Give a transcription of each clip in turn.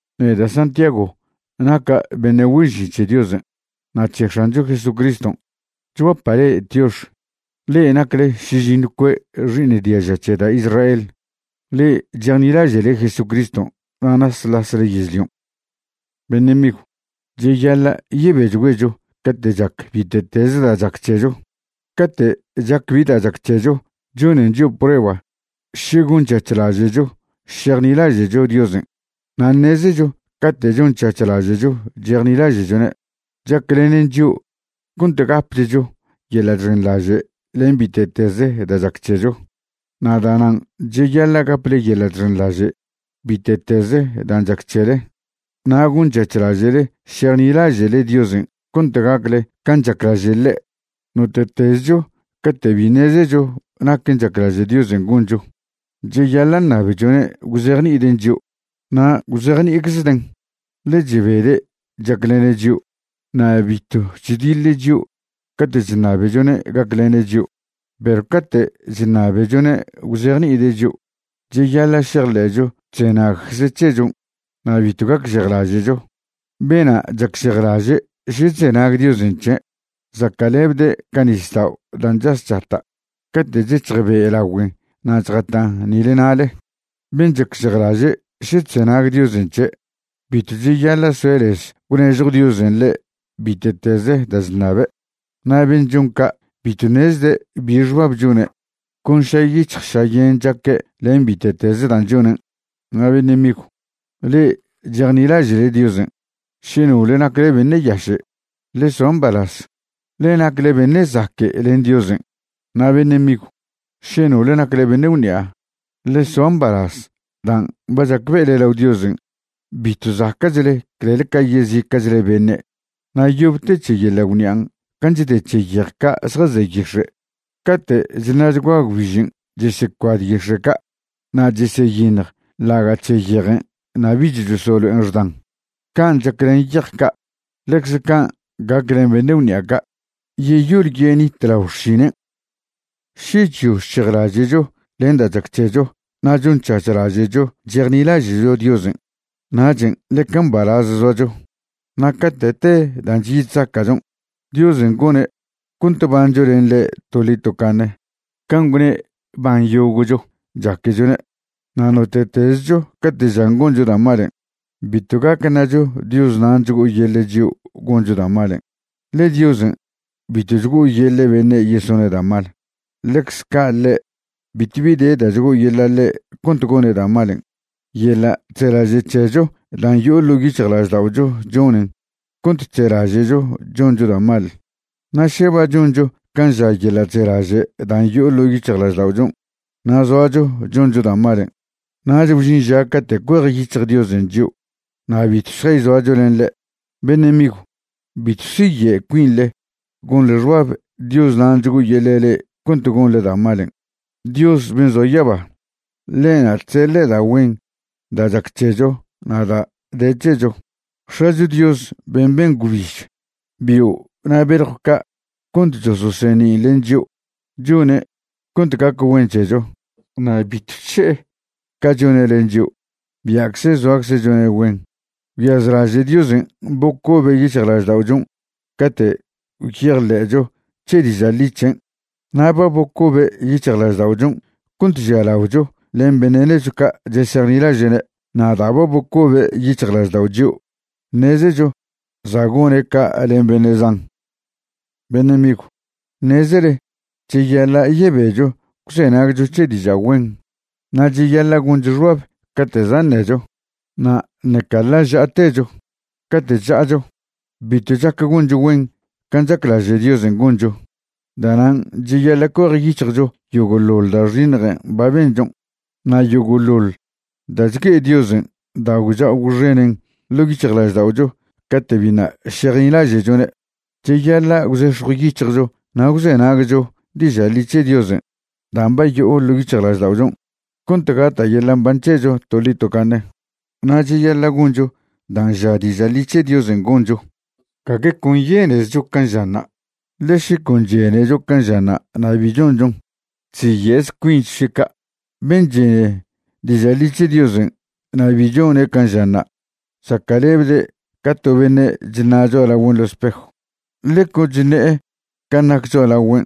Neda' Santiago naca' beṉe' güen žin c̱he Diosen' na' c̱he X̱ancho Jesucriston'. Chguapa' le'e tiox, le'e nacle šižiṉw cue' xi'iṉ diaža c̱he da' Israel, le'e chejnilaže'le Jesucriston' na' nasḻasle yežlion'. Beṉe' migw, cheyaḻa' yebechgüecho cate' chac bite'teze da' chac c̱hecho. Cate' chac bi da' chac c̱hecho chonen chio' prueba še gonc̱hac̱hlaže'cho šejnilaže'cho Diosen'. Na' ṉezecho cate' chonc̱hac̱hlaže'cho chejnilaže'chone', chaclenen chio' cont gapchcho yeḻa' chxenḻaže' len bite'teze da' chac c̱hecho. Na' da'nan' cheyaḻa' gaple yeḻa' chxenḻaže' bite'teze dan' chac c̱hele na' gonc̱hac̱hlaže'le šejnilaže'le Diosen' cont gacle can' chaclaže' ḻe'. Note'tezcho cate' bi ṉezecho naquen' chaclaže' Diosen' goncho, cheyaḻa' ṉabechone' gwzejni'iden' chio', na' gwzejni'iczeden'. Ḻe chebede' chaclene' chio', na' bitw chdiḻe' chio' cate' chṉabechone' gaclene' chio'. Perw cate' chṉabechone' gwzejni'ide' chio', cheyaḻa' šejḻe'cho chzenagcze' c̱hechon' na' bitw gacžejlaže'cho. Bena' chacžejlaže' še chzenag Diosen' c̱he', zaca'lebde' ca nisdao' dan' chas chata' cate' chec̱hj be' lagüen' na' chjatan' nile na'le. Ben' chacžejlaže' še chzenag Diosen' c̱he', bitw cheyaḻa' soe' lez gwnežjw Diosen' ḻe' bite'teze da' chṉabe'. Na' ben' chon ca' bitw ṉezde' bi xbab chone', con šayic̱hj šayen chaque' len bite'teze dan' chonen'. Na' beṉe' migw, le'e chejnilaže'le Diosen', še nole nacle beṉe' yaše', ḻe soa mbalaz, ḻe nacle beṉe' zaque' len Diosen'. Na' beṉe' migw, še nole nacle beṉe' gwṉi'a, ḻe soa mbalaz dan' ba chacbe'ele lao Diosen' bitw zaca'chle clel ca yezica'chle beṉe'; na' yob te c̱he yeḻa' gwṉi'an' can' chde c̱he yej ca' zjaze yix̱e'. Cate' chṉa'chgua gwbižen' chesecuad yix̱e' ca', na' cheseyiṉj ḻaga' c̱he yejen' na' bich chosolo'en xdan. Can' chac len yej ca', ḻecze can' gac len beṉe' gwṉi'a ca', yeyol yenite' lao xšinen'. Še chyo chc̱hejlaže'cho len da' chac c̱hecho na' chonc̱hac̱hlaže'cho chejnilaže'cho Diosen', nachen' ḻeca mbalaz zoacho. Na' cate' te dan' chyi chzaca'chon', Diosen' gone' cont bancho len ḻe' toḻi tocaṉe can' gwne' ban yogo'cho chaquechone'. Na' note'tezcho cate' žan goncho da' malen', bitw gac ṉacho Dios nan' chgo'oyeḻe' chio' goncho da' malen', ḻe Diosen' bitw chgo'oyeḻe' beṉe' yesone' da' mal. Ḻecze ca' ḻe', bitw bi de da' chgo'oyeḻa' ḻe' cont gone' da' malen'. Yeḻa' chzelaže' c̱hecho dan' yo'o ḻo' yic̱hjlažda'ocho chonen cont chzelaže'cho choncho da' mal. Na' še ba choncho can' ža yeḻa' chzelaže' dan' yo'o ḻo' yic̱hjlažda'ochon' na' zoacho choncho da' malen', nach gwžin ža cate' cuejyic̱hj Diosen' chio' na' bitw šjayzoacho len ḻe'. Beṉe' migw, bitw siye' cuinḻe gonḻe xbab Dios nan' chgo'oyeḻe' le'e cont gonḻe da' malen'. Dios ben' zoa yaba, ḻe'na' chseḻe' da' güen da' chac c̱hecho na' da' de c̱hecho. X̱acho Dios ben' ben gwbiž, bio' na' beljw ca' cont chososeṉin' len chio', chone' cont gac güen c̱hecho, na' bitw chše'e ca chone' len chio', bia'cze zoacze' chone' güen. Gwyazlaže' Diosen' bocobe' yic̱hjlažda'ochon' cate' gwyejḻe'cho c̱he diža' ḻi c̱hen'. Na' ba bocobe' yic̱hjlažda'ochon' cont žialaocho len beṉe' nechw ca' chesejnilaže'ne'. Na' da' ba bocobe' yic̱hjlaždao' chio', ṉezecho za' gone' ca' len beṉe' zan. Beṉe' migw, ṉezele cheyaḻa' yebecho gwzenagcho c̱he diža' güen, na' cheyaḻa' goncho xbab cate' za' ṉecho, na' ṉeca ḻa' ža'atecho. Cate' chža'acho, bitw chac goncho güen can' chaclaže' Diosen' goncho. Da'nan' cheyaḻa' cuejyic̱hjcho yogo'ḻoḻ da' xiṉjen' ba benchon' na' yogo'ḻoḻ da' chgue'e Diosen' da' gwcha'o gwxenen ḻo' yic̱hjlažda'ocho cate' biṉa' šejnilaže'chone'. Cheyaḻa' gwzex̱jw yic̱hjcho na' gwzenagcho diža' ḻi c̱he Diosen' dan' ba yo'o ḻo' yic̱hjlažda'ochon', cont gata' yeḻa' mban c̱hecho toḻi tocaṉe. Na' cheyaḻa' goncho dan' ža diža' ḻi c̱he Diosen' goncho, gague con yenezcho can' žanṉa'. Ḻe še con chenecho can' žanṉa' na' bi chonchon, chziye'ze cuincho še ca'. Ben' chene diža' ḻi c̱he Diosen' na' bi chone' can' žanṉa', zaca'lebde' ca to beṉe' chṉa' cho'alagüen' ḻo spejw, ḻe con chṉe'e can' nac cho'alagüen'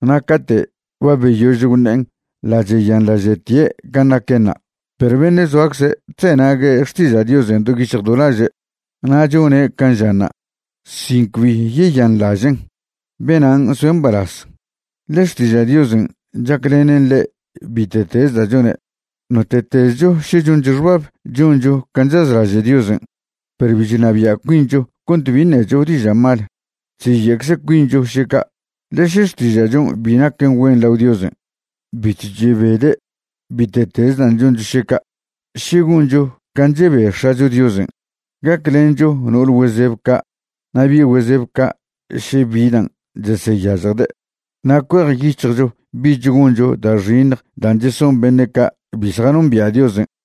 na' cate' ba beyož gwṉe'en ḻa' cheyanḻažtie' can' naquenṉa'. Perw beṉe' zoacze' chzenague' xtiža' Diosen' do yic̱hj do laže' na' chone' can' žanṉa' sin cbi yeyanḻažen', benan' soe' mbalaz, ḻe xtiža' Diosen' chaclenen ḻe' bite'tez da' chone'. Note'tezcho še choncho xbab choncho can' chazlaže' Diosen', perw bi chnabia' cuincho cont bi ṉecho diža' mal, chziye'cze cuincho še ca'. Ḻe še xtiža'chon' bi naquen güen lao Diosen', bitw chebede' bite'tez dan' choncho še ca'. Še goncho can' chebe X̱acho Diosen', gaclencho no'ole güezeb ca' na' bi' güezeb ca' še bi dan' cheseyažjde', na' cuejyic̱hjcho bich goncho da' xiṉj dan' cheson beṉe' ca' bi zjanombia' Diosen'.